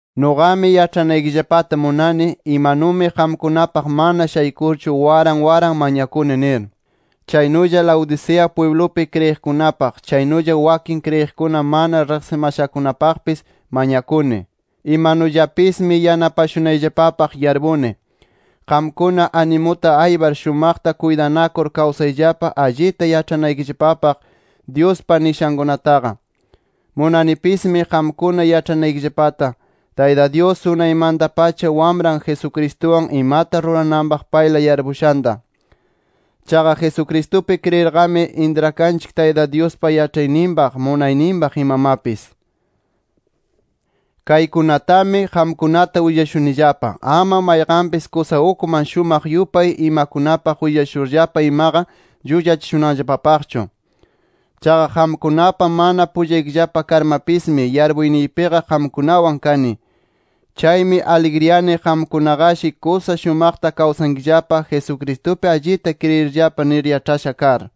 Nuqami yaĉhanaykillapata munani, imanumi qamkunapaq mana shaykurchu waran waran mañakuni nir. Chaynulla Laodicea pwiblupi kriyiqkunapaq, chaynulla wakin kriyiqkuna mana riqsimashakunapaqpis mañakuni. Imanullapismi yanapashunayllapapaq yarpuni. Qamkuna animuta aypar shumaqta kuytanakur kawsayllapa, allita yaĉhanaykillapapaq Dyuspa nishankunataqa. Munanipismi qamkuna yaĉhanaykillapata, Tayta Dyus unaymanta-pacha Wamran Jesucristuwan imata rurananpaq payla yarpushanta. Chaqa Jesucristupi kriyirqami, intrakanchik Tayta Dyuspa yaĉhayninpaq, munayninpaq imamapis. Kaykunatami, qamkunata willashunillapa, ama mayqanpis kusa ukman shumaq yupay imakunapaq willashurllapa imaqa llullachishunanllapapaqchu. Chaqa qamkunapa mana pullaykillapa karmapismi, yarpuyniypiqa qamkunawan kani. Chaymi aligriyani qamkunaqashi kusa shumaqta kawsankillapa Jesucristupi allita kriyirllapa nir yaĉhasha kar.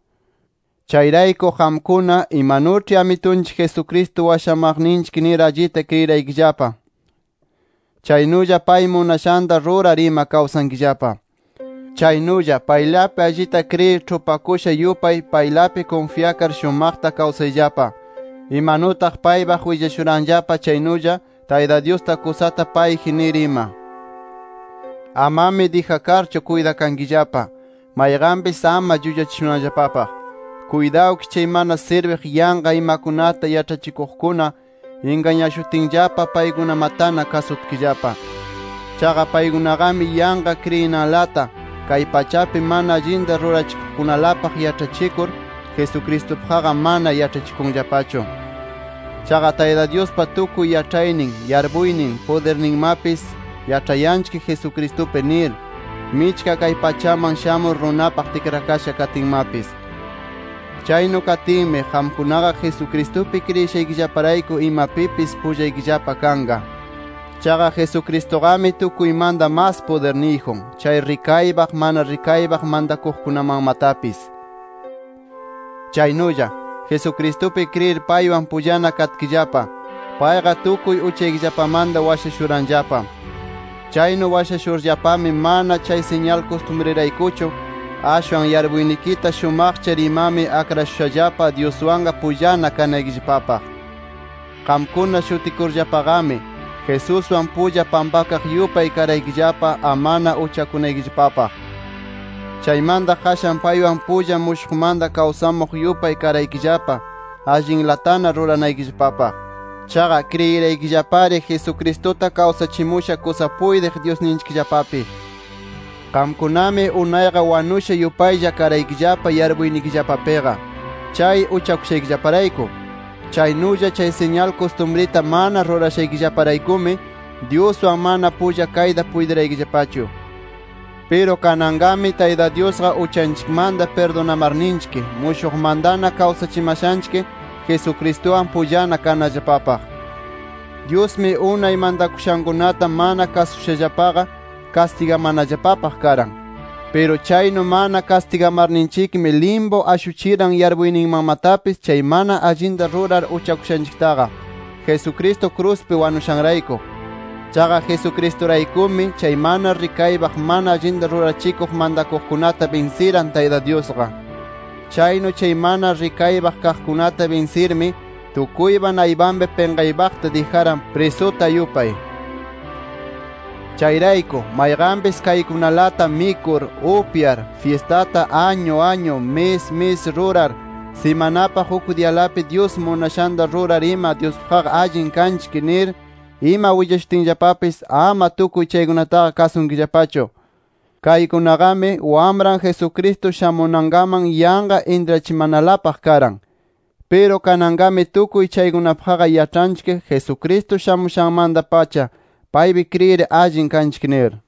Chayrayku qamkuna, imanuĉhi Amitunchik Jesucristo washamaqninchik nir allita kriyiraykillapa, chaynulla pay munashanta rurar ima kawsankillapa. Chaynulla, paylapi allita kriyir ĉhupakusha yupay, paylapi kunfyakar shumaqta kawsayllapa, imanutaq paypaq willashuranllapa chaynulla, Tayta Dyusta kusata payji nir ima. Amami dijakarchu kuytakankillapa, mayqanpis ama llullachishunanllapapaq. Kuytawkish chay mana sirbiq yanqa imakunata yaĉhachikuqkuna ingañashutinllapa paykunamatana kasutkillapa. Chaqa paykunaqami yanqa kriyinanlata, kay pachapi mana allinta rurachikuqkunalapaq yaĉhachikur, Jesucristupaqqa mana yaĉhachikunllapachu. Chaqa Tayta Dyuspa tukuy yaĉhaynin, yarpuynin, pudirninmapis, yaĉhayanchik Jesucristupi nir, michka kay pachaman shamur runapaq tikrakasha katinmapis. Chaynu katinmi, qamkunaqa Jesucristupi kriyishaykillaparayku imapipis pullaykillapa kanqa. Chaqa Jesucristuqami tukuymanta mas pudirniyjun, chay rikaypaq, mana rikaypaq mantakuqkunamanmatapis. Chaynulla, Jesucristupi kriyir paywan pullana katkillapa, payqa tukuy uchaykillapamanta washashuranllapa. Chaynu washashurllapami, mana chay siñal kustumriraykuchu, ashwan yarpuynikita shumaqchar imami akrashushallapa Dyuswanqa pullana kanaykillapapaq. Qamkuna shutikurllapaqami, Jesuswan pulla pampakaq yupay karaykillapa amana uchakunaykillapaq. Chaymanta qashan paywan pulla mushuqmanta kawsamuq yupay karaykillapa, allinlatana ruranaykillapapaq. Chaqa kriyiraykillapari Jesucristuta kawsachimusha kusa puytiq Dyusninchikllapapi. Qamkunami unayqa wanusha yupaylla karaykillapa yarpuynikillapapiqa, chay uchakushaykillaparayku. Chaynulla, chay siñal kustumrita mana rurashaykillaparaykumi, Dyuswan mana pulla kayta puytiraykillapachu. Piru kananqami Tayta Dyusqa uchanchikmanta pirdunamarninchik, mushuqmantana kawsachimashanchik, Jesucristuwan pullana kanallapapaq. Dyusmi unay mantakushankunata mana kasushallapaqa, kastigamanallapapaq karan. Piru chaynu mana kastigamanarninchikmi, limpu ashuchiran yarpuyninmanmatapis chay mana allinta rurar uchakushanchiktaqa, Jesucristo kruspi wanushanrayku. Chaqa Jesucristuraykumi, chay mana rikaypaq mana allinta rurachikuq mantakuqkunata binsiran, Tayta Dyusqa. Chaynu chay mana rikaypaq kaqkunata binsirmi, tukuypa naypanpi pinqaypaqta dijaran, prisuta yupay. Chayrayku mayqanpis kaykunalata mikur, upyar, fyistata añu añu, mis mis rurar, simanapaq uk diyalapi Dyus munashanta rurar ima Dyuspaqqa allin kanchik nir ima willashutinllapapis, ama tukuy chaykunataqa kasunkillapachu. Kaykunaqami, Wamran Jesucristo shamunankaman yanqa intrachimanalapaq karan. Piru kananqami tukuy chaykunapaqqa yaĉhanchik, Jesucristo shamushanmanta-pacha, paypi kriyir allin kanchik nir.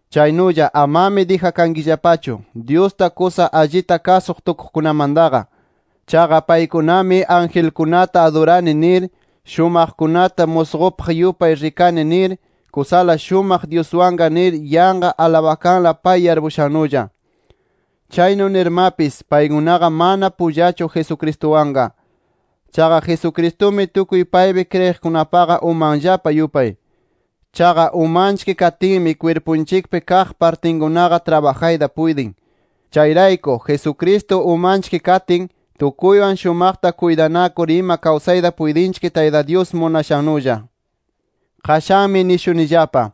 Chaynulla amami dijakankillapachu, Dyusta kusa allita kasuq tukuqkunamantaqa. Chaqa paykunami angelkunata adurani nir, shumaqkunata musqupaq yupay rikani nir, kusala shumaq Dyuswanqa nir yanqa alabakanla pay yarpushannulla. Chaynu nirmapis, paykunaqa mana pullachu Jesucristuwanqa. Chaqa Jesucristumi tukuy paypi kriyiqkunapaqa umanllapa yupay. Chaqa umanchik katinmi kwirpunchikpi kaq partinkunaqa trabajayta puytin. Chayrayku Jesucristo umanchik katin, tukuywan shumaqta kuytanakur ima kawsayta puytinchik Tayta Dyus munashannulla. Qashanmi nishunillapa: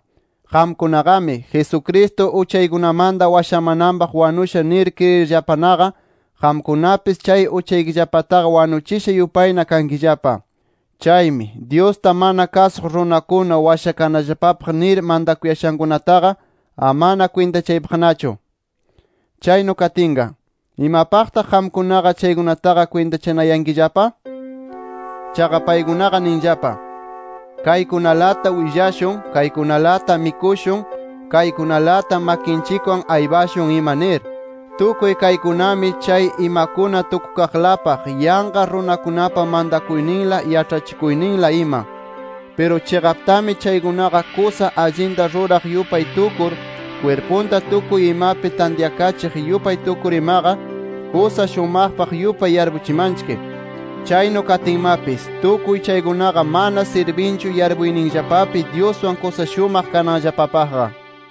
Qamkunaqami, Jesucristo uchaykunamanta washamananpaq wanusha nir kriyirllapanaqa, qamkunapis chay uchaykillapataqa wanuchisha yupayna kankillapa. Chaymi, Dyusta mana kasuq runakuna washakanallapapaq nir mantakuyashankunataqa, amana kwintachaypaqnachu. Chaynu katinqa, ¿imapaqtaq qamkunaqa chaykunataqa kwintachanayankillapa? Chaqa paykunaqa ninllapa: Kaykunalata willashun, kaykunalata mikushun, kaykunalata makinchikwan aypashun ima nir. Tukuy kaykunami, chay imakuna tukukaqlapaq, yanqa runakunapa mantakuyninla, yaĉhachikuyninla, ima. Piru chiqaptami chaykunaqa kusa allinta ruraq yupay tukur, kwirpunta tukuy imapi tantyakachiq yupay tukur imaqa, kusa shumaqpaq yupay yarpuchimanchik. Chaynu katinmapis, tukuy chaykunaqa mana sirbinchu yarpuyninllapapi Dyuswan kusa shumaq kananllapapaqqa.